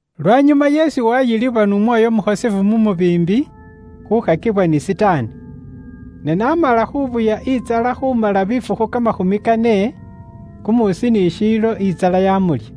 Lwanyuma Yesu waayilibwa n'Umwoyo Umukhosefu mu mubiimbi khuukhakibwa ni Sitaani. Ne n'amala khuubuya intsala khuumala bifukhu kamakhumi kane kumuusi ni shiilo, intsala yamulya.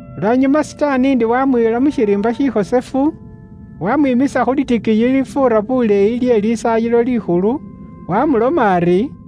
Lwanyuma Sitaani ndi waamuyila mu shiriimba shikhosefu, waamwimisa khu litikiiyi lilifuura buleeyi lye Lisaayilo Likhulu, waamuloma ari,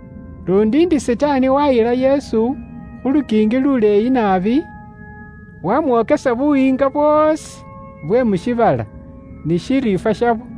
Luundi ndi Sitaani waayila Yesu khu lukiingi luleeyi naabi, waamwokesa buyiinga bwoosi bwe mu shiibala, ni shiriifwa shabwo.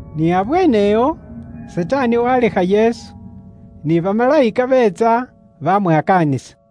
Ni abweenewo, Sitaani waalekha Yesu, ni bamalayika beetsa bamwakaanisa.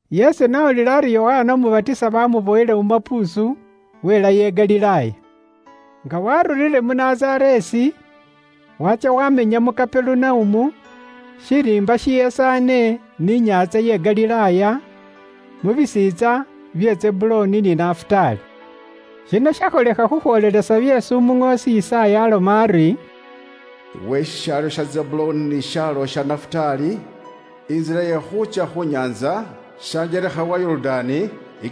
Yesu n'awulila ari Yokana Umubatisa baamuboyile mu mapuusu, welayo i Galilaaya. Nga waarurire mu Nazareesi, waatsya waamenya mu Kaperunaumu, shiriimba shishesaane ni inyaantsa ye Galilaaya, mu bisiintsa bya Zebuloni ni Nafutaali. Shino shakholekha khukhwoolelesa byeesi umuŋoosi Yisaaya aaloma ari, “Iwe shishaalo sha Zebuloni ni shishaalo sha Nafutaali, intsila ye khuutsya khu nyaantsa, shanjelekha wa Yorudaani,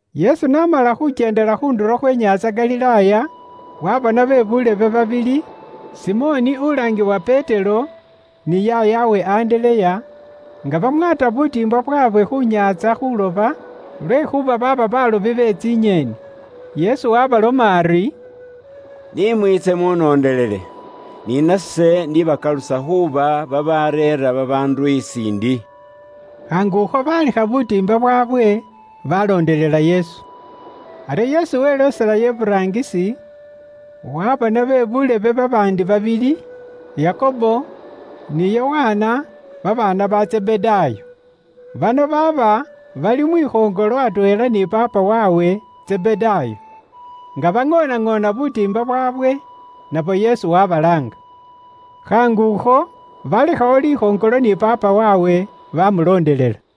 Yesu n'aba nga akyeendela khu ndulo khwe nyaantsa Galilaaya, waabona be buulebe babili, Simoni uwalaangiwa Petero, ni yaayawe Andereya nga bamwaata butiimba bwaabwe khu nyaantsa khuuloba, lwekhuuba baaba baalobi be tsinyeeni. Yesu waabaloma ari, “Ni mwiitse munondelele, ni nase ndibakalusa khuuba babaareera babaandu isiindi.” Khaangukho, baalekha butiimba bwaabwe, baaloondelela Yesu. Aryo Yesu welooselayo iburaangisi, waabona be buulebe babaandi babili, Yakobo ni Yokana, babaana ba Zebedaayo. Bano baaba bali mwikhoŋolo atweela ni paapa waabwe Zebedaayo, nga baŋoonaŋoona butiimba bwaabwe. Nabo Yesu wabalaanga. Khaangukho, baalekhawo likhoŋolo ni paapa waabwe, baamuloondelela.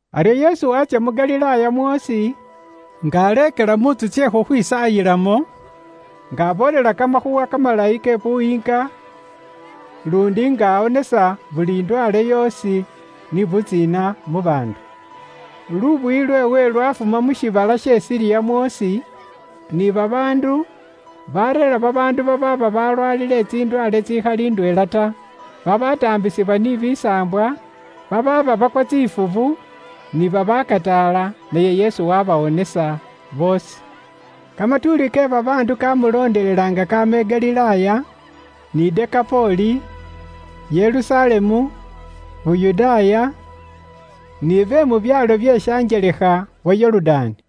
Aryo Yesu waatsya mu Galilaaya mwoosi, nga aleekela mu ntsu tsye khukhwisaayilamo, nga aboolela Kamakhuuwa Kamalayi ke Buyiinga luundi nga awonesa buli ndwaale yoosi ni butsiina mu baandu. Lubuyi lweewe lwafuma mu shiibala sha Siriya mwoosi, ni babaandu bareera babaandu babaaba balwaalile tsindwaale tsitsikhali ndweela ta, babataambisibwa ni kimisaambwa, babaaba bakwa tsifubu, ni babaakataala, naye Yesu waabawonesa boosi. Kamatuuli ke babaandu kaamulondelela nga kaama i Galilaaya, ni Dekapoli, Yerusalemu, Yuda, ni be mu byaalo bye shanjelekha wa Yorudaani.